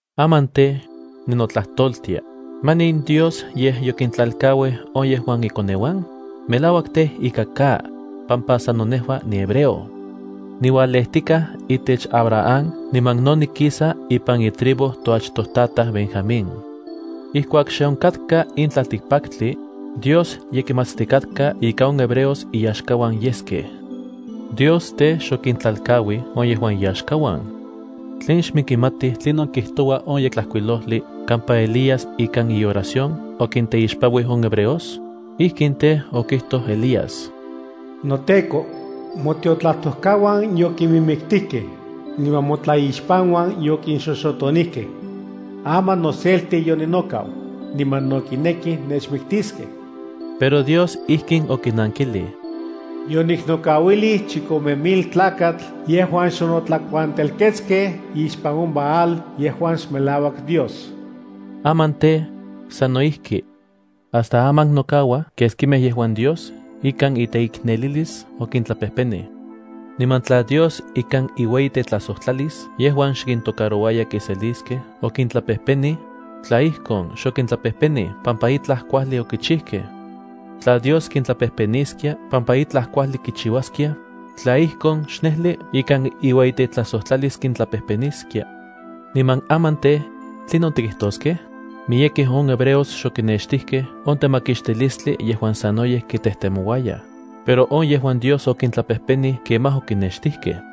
Aman tej, ninotlajtoltia: ¿Manin Dios yej yokitlalkauij on yejuan ikoneuan? ¡Melauak tej ika ka, pampa sano nejua nihebreo! Niualejtikaj itech Abraham niman no nikisa ipan itribu toachtojtataj Benjamín. Ijkuak xe onkatka in tlaltikpaktli, Dios ye kimatstikatka ika on hebreos iyaxkauan yeskej. Dios tej, xokintlalkauij on yejuan iyaxkauan. ¿Tlen xnenkimatij tlinon kijtoua on Yektlajkuilojli kampa Elías ikan ioración okinteixpanuij on hebreos? Ijkin tej, okijtoj Elías: “NoTEKO, motiotlajtojkauan yokinmiktijkej, niman motlaixpanuan yokinxoxotonijkej. Aman noselti yoninokau, niman no kinekij nechmiktiskej.” Pero Dios ijkin okinankilij: “Yoniknokauilij chikome mil tlakatl yejuan xonotlakuantelketskej ixpan on Baal yejuan xmelauak dios.” Aman tej, sano ijki. Hasta aman nokauaj keskimej yejuan Dios ikan iteiknelilis okintlapejpenij. Niman tla Dios ikan iueyitetlajsojtlalis yejuan xkintocarouaya kiseliskej okintlapejpenij, tla ijkon, xokintlapejpenij pampa itlaj kuajli okichijkej. Tla Dios kintlapejpeniskia pampa itlaj kuajli kichiuaskiaj, tla ijkon, xnejli ikan iueyitetlajsojtlalis kintlapejpeniskia. ¿Niman aman tej, tlinon tikitoskej? Miyekej on hebreos xokinextijkej on temakixtilistli yejuan sanoyej kitejtemouayaj, pero on yejuan Dios okintlapejpenij kemaj okinextijkej.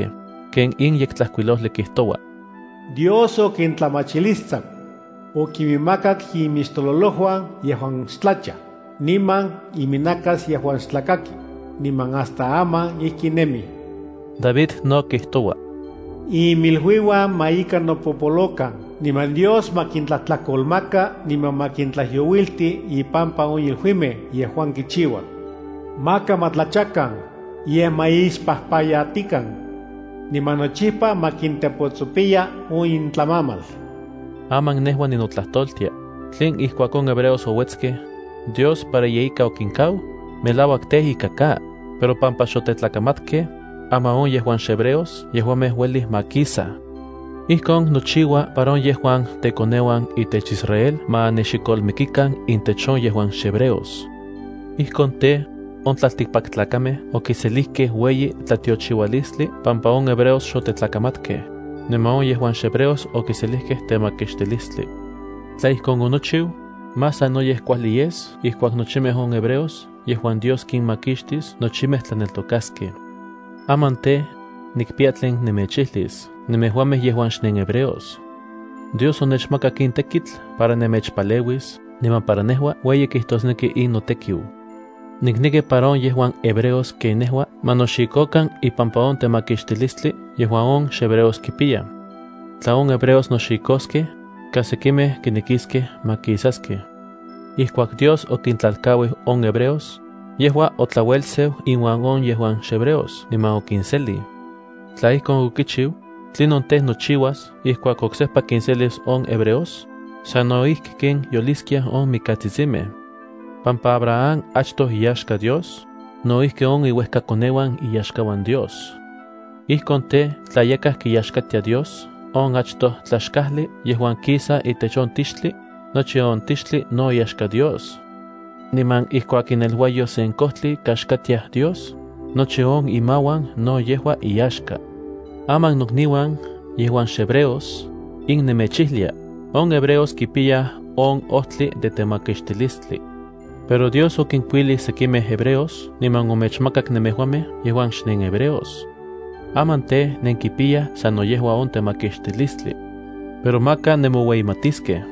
ken in Yektlajkuilojli kijtoua: “Dios okintlamachilistsaku. Okinmakak imixtololojuan yejuan xtlachaj, niman iminakasuan yejuan xtlakakij, niman hasta aman ijki nemij.” David no kijtoua: Inmiluiuan ma ika nopopolokan niman Dios ma kintlajtlakolmaka, niman ma kintlajyouilti ipampa on iluimej yejuan kichiuaj. Maka ma tlachakan, yej ma ixpajpayatikan. Niman nochipa ma kintepotsopiya on intlamamal. Aman nejua ninotlajtoltia: ¿Tlen ijkuak on hebreos ouetskej, Dios para yeika okinkau? ¡Melauak tej ika ka! Pero pampa xotetlakamatkej, aman on yejuan xhebreos yejuamej uelij makisaj. Ijkon nochiua para on yejuan tekoneuan itech Israel ma nexikolmikikan intech on yejuan xhebreos. Ijkon tej, on tlaltikpaktlakamej okiselijkej ueyi tlatiochiualistli pampa on hebreos xotetlakamatkej, niman on yejuan xhebreos okiselijkej temakixtilistli. Tla ijkon onochiu, más sanoyej kuajli yes ijkuak nochimej on hebreos yejuan Dios kinmakixtis nochimej tlaneltokaskej. Aman tej, nikpiya tlen nemechijlis nemejuamej yejuan xnenhebreos. Dios onechmakak in tekitl para nemechpaleuis niman para nejua ueyi kijtosneki in notekiu. Nikneki para on yejuan hebreos ken nejua ma noxikokan ipampa on temakixtilistli yejuan on xhebreos kipiyaj. Tla on hebreos noxikoskej, kas sekimej kinekiskej makisaskej. Ijkuak Dios okintlalkauij on hebreos, yejua otlauelseu inuan on yejuan xhebreos niman okinselij. Tla ijkon okichiu, ¿tlinon tej, nochiuas ijkuak oksejpa kinselis on hebreos? Sanno ijki ken yoliskiaj on mikatsitsimej. Pampa Abraham achtoj iyaxka Dios, no ijki on iuejkakoneuan iyaxkauan Dios. Ijkon tej, tla yakaj kiyaxkatia Dios on achtoj tlaxkajli yejuan kisa itech on tixtli, nochi on tixtli no iyaxka Dios. Niman ijkuak ineluayo sen kojtli kaxkatiaj Dios, nochi on imauan no yejua iyaxka. Aman nokniuan yejuan xnenhebreos, in nemechijlia: on hebreos kipiyaj on ojtli de temakixtilistli. Pero Dios okinkuilij sekimej hebreos niman omechmakak nemejuamej yejuan xnenhebreos. Aman tej, nenkipiyaj sano yejua on temakixtilistli. Pero maka nenmoueyimatiskej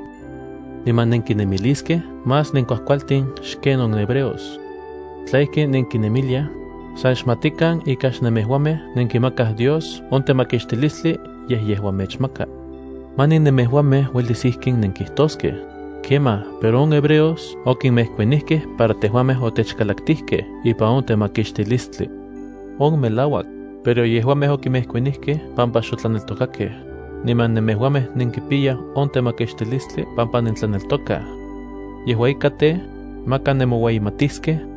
niman nenkinemiliskej más nenkuajkualtin xken on hebreos. Tla ijki nenkinemiliaj, san xmatikan ika xnemejuamej nenkimakaj Dios on temakixtilistli yej yejua mechmaka. Manin nemejuamej uelis ijkin nenkijtoskej: “Kemaj, pero on hebreos okinmejkuanijkej para tejuamej otechkalaktijkej ipan on temakixtilistli.” On melauak, pero yejuamej okinmejkuanijkej pampa xotlaneltokakej, niman nemejuamej nenkipiyaj on temakixtilistli pampa nentlaneltokaj. Yejua ika tej, maka nenmoueyimatiskej,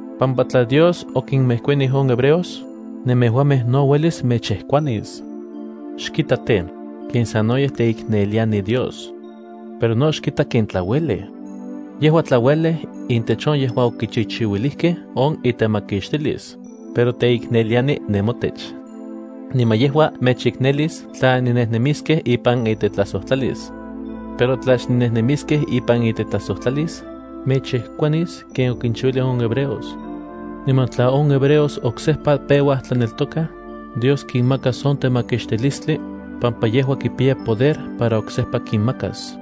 pampa tla Dios okinmejkuanij on hebreos, nemejuamej no uelis mechmejkuanis. Xkita tej, ken sanoyej teikneliani Dios. Pero no xkita ken tlauelej. Yejua tlauelej intech on yejuan okichichiuilijkej on itemakixtilis, pero teikneliani nemotech. Niman yejua mechiknelis tla nennejnemiskej ipan itetlajsojtlalis. Pero tla xnennejnemiskej ipan itetlajsojtlalis, mechmejkuanis ken okinchiuilij on hebreos. Niman tla on hebreos oksejpa peuaj tlaneltokaj, Dios kinmakas on temakixtilistli, pampa yejua kipiya poder para oksejpa kinmakas.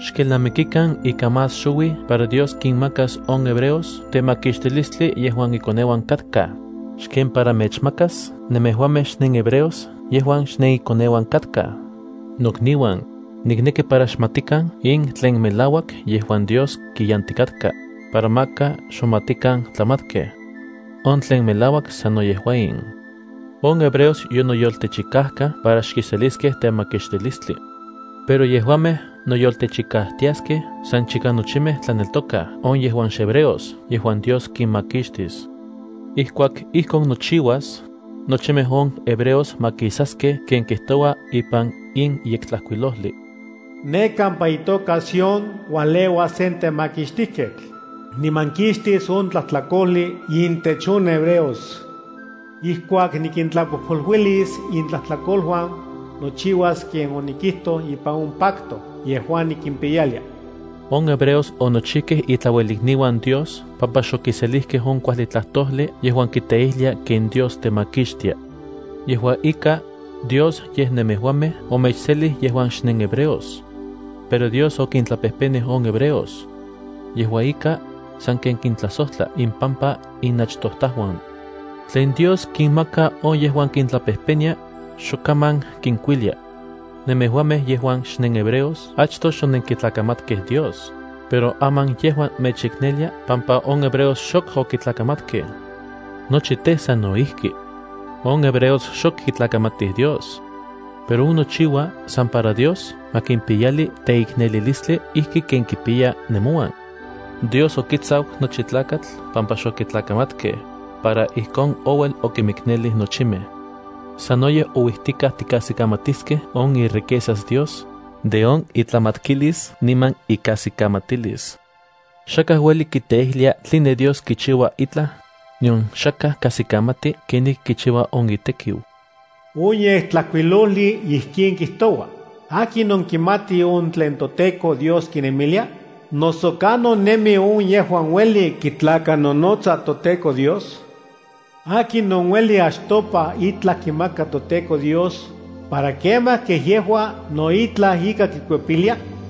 Xkelnamikikan ika más xouij para Dios kinmakas on hebreos temakixtilistli yejuan ikoneuan katkaj, xken para mechmakas nemejuamej xnenhebreos yejuan xnenikoneuan katkaj. Nokniuan, nikneki para xmatikan in tlen melauak yejuan Dios kiyantikatka, para maka xmomatikan tlamatkej. On tlen melauak sano yejua in: on hebreos yonoyoltechikajkaj para xkiseliskej temakixtilistli. Pero yejuamej noyoltechikajtiaskej san chika nochimej tlaneltokaj on yejuan xhebreos yejuan Dios kinmakixtis. Ijkuak ijkon nochiuas, nochimej on hebreos makisaskej ken kijtoua ipan in Yektlajkuilojli: Ne kampa itoka Sión ualeuas sen temakixtijketl, niman kixtis on tlajtlakojli intech on hebreos. Ijkuak nikintlapojpoluilis intlajtlakoluan, nochiuas ken onikijtoj ipan on pacto yejuan nikimpiyalia. On hebreos onochijkej itlauelikniuan Dios pampa xokiselijkej on kuajli tlajtojli yejuan kiteijlia ken Dios temakixtia. Yejua ika, Dios yej nemejuamej omechselij yejuan xnenhebreos. Pero Dios okintlapejpenij on hebreos. Yejua ika, sanken kintlajsojtla impampa inachtojtajuan. Tlen Dios kinmaka on yejuan kintlapejpenia, xok kaman kinkuilia. Nemejuamej yejuan xnenhebreos achtoj xonenkitlakamatkej Dios, pero aman yejua mechiknelia pampa on hebreos xok okitlakamatkej. Nochi tej, sano ijki. On hebreos xok kitlakamatij Dios. Pero on nochiua san para Dios ma kimpiyali teiknelilistli ijki ken kipiya nemouan. Dios okitsaku nochi tlakatl pampa xokitlamatkej, para ijkon ouel okinmiknelij nochimej. ¡Sanoyej ouijtikaj tikajsikamatiskej on iriquezas Dios, de on itlamatkilis niman ikajsikamatilis! Xakaj ueli kiteijlia tline Dios kichiua itlaj, nion xakaj kajsikamati kenijki kichiua on itekiu. On Yektlajkuilojli ijkin kijtoua: “¿Akinon kimati on tlen toTEKO Dios kinemilia? Noso, ¿kanon nemi on yejuan ueli kitlakanonotsa toTEKO Dios? ¿Akinon ueli achtopa itlaj kimaka toTEKO Dios, para kemaj kej yejua no itlaj ika kikuepilia?”